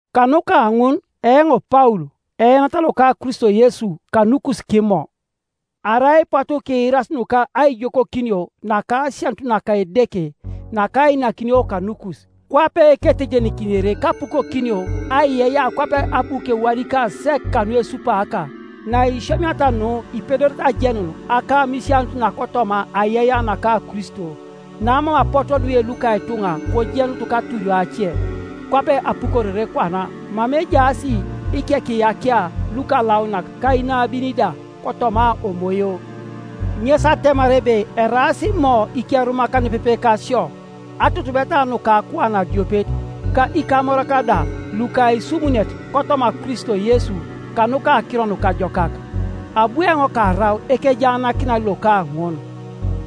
Kanuka ŋun eoŋ Paul, eenat loka Kristo Yesu kanukus kImo,— arai ipotu kiirasi nuka aijokokinio naka asianut naka. Edeke nakainakinio kanukus, kwape ketejenikinere kapukokinio aiyeiyea kwape abu kewadikaa sek kanuesupaaka. Naisiomiata nu ipedorete ajenun akamisianut nakotoma aiyeiyea naka Kristo, namam apotu odwe luka ituŋa kojenut katurio ace, kwape apukorere kwana mama ejaas ikekiyakia lukalaunak ka inabin da kotoma Omoyo; ŋes atemar ebe eraas Imo ikerumak nepepe kasio, atutubeta nuka akuan adiopet, ka ikamorak da luka aisumunet kotoma Kristo Yesu kanuka Akiro Nukajokak. Abu eoŋ karau ekejaanakinan loka ŋun,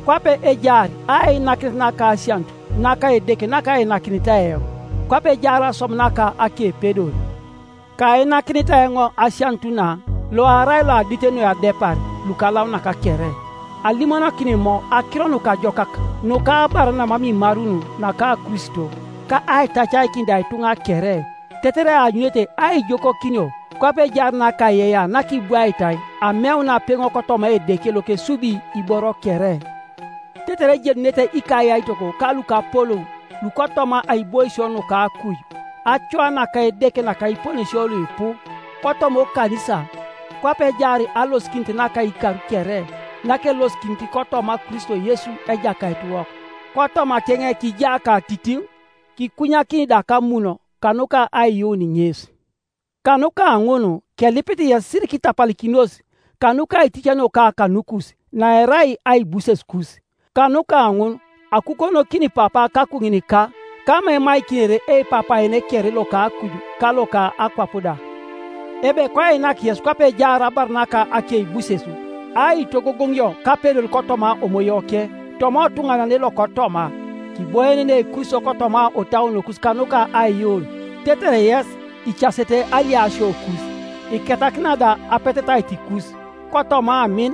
kwape ejaar ainakinet naka asianut naka Edeke nakainakinitai eoŋ, kwape ejaar aswam naka akepedor. Kainakinitai eoŋ asianut na, loarai loadit noi adepar lukalaunak kere alimonokin Imo Akiro Nukajokak nuka abar namam imarun naka Kristo, ka aitacaikin da ituŋa kere tetere eanyunete aijokokinio kwape ejaar nakaiyeiyea nakibwaitai ameun apeŋo kotoma Edeke lokesubi iboro kere; tetere ejenunete ikayaitok ka lukapolou lukotoma aiboisio nuka akuj, acoa naka Edeke nakiponesio luipu, kotoma okanisa; kwape ejaar alosikinit naka ikar kere nakelosikinit kotoma Kristo Yesu Ejakaitiwok. Kotomakeŋ kija katitiŋ, kikunyakini da kamun, kanuka aiyuun ŋes. Kanuka ŋun kelipit yes sirikitapalikinos kanuka aiticanioka kanukus, naerai aibusesukus. Kanuka ŋun akukonokin Papa kakuŋinika, kama emaikinere eipapaene kere loka akuj ka loka akwap da, ebe koinak yes kwape ejaar abar naka akeibuses, aitogogoŋio kapedor kotoma Omoyoke toma otuŋanane lokotoma, kiboienenei Kristo kotoma otauonokus kanuka aiyuun; tetere yes, icasete aliasiokus, iketakina da apetetaitikus, kotoma amin,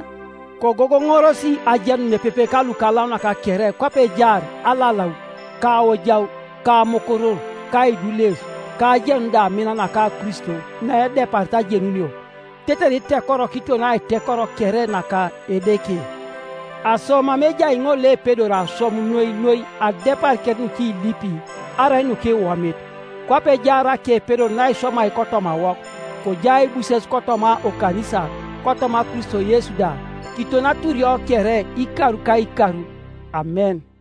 kogogoŋoros ajenun nepepe kalukalaunak kere kwape ejaar alalau, ka aojau, ka amukurur, ka aidules, ka ajenun da amin naka Kristo naedeparit ajenunio, tetere itekoro kiton aitekoro kere naka Edeke. Aso mama ejai ŋol loepedori aswam noi noi adepar kere nukilipi arai nukiwomit, kwape ejaar akepedor naiswamai kotomawok, kojai aibuses kotoma okanisa, kotoma Kristo Yesu da, kiton aturio kere ikar ka ikar. Amen.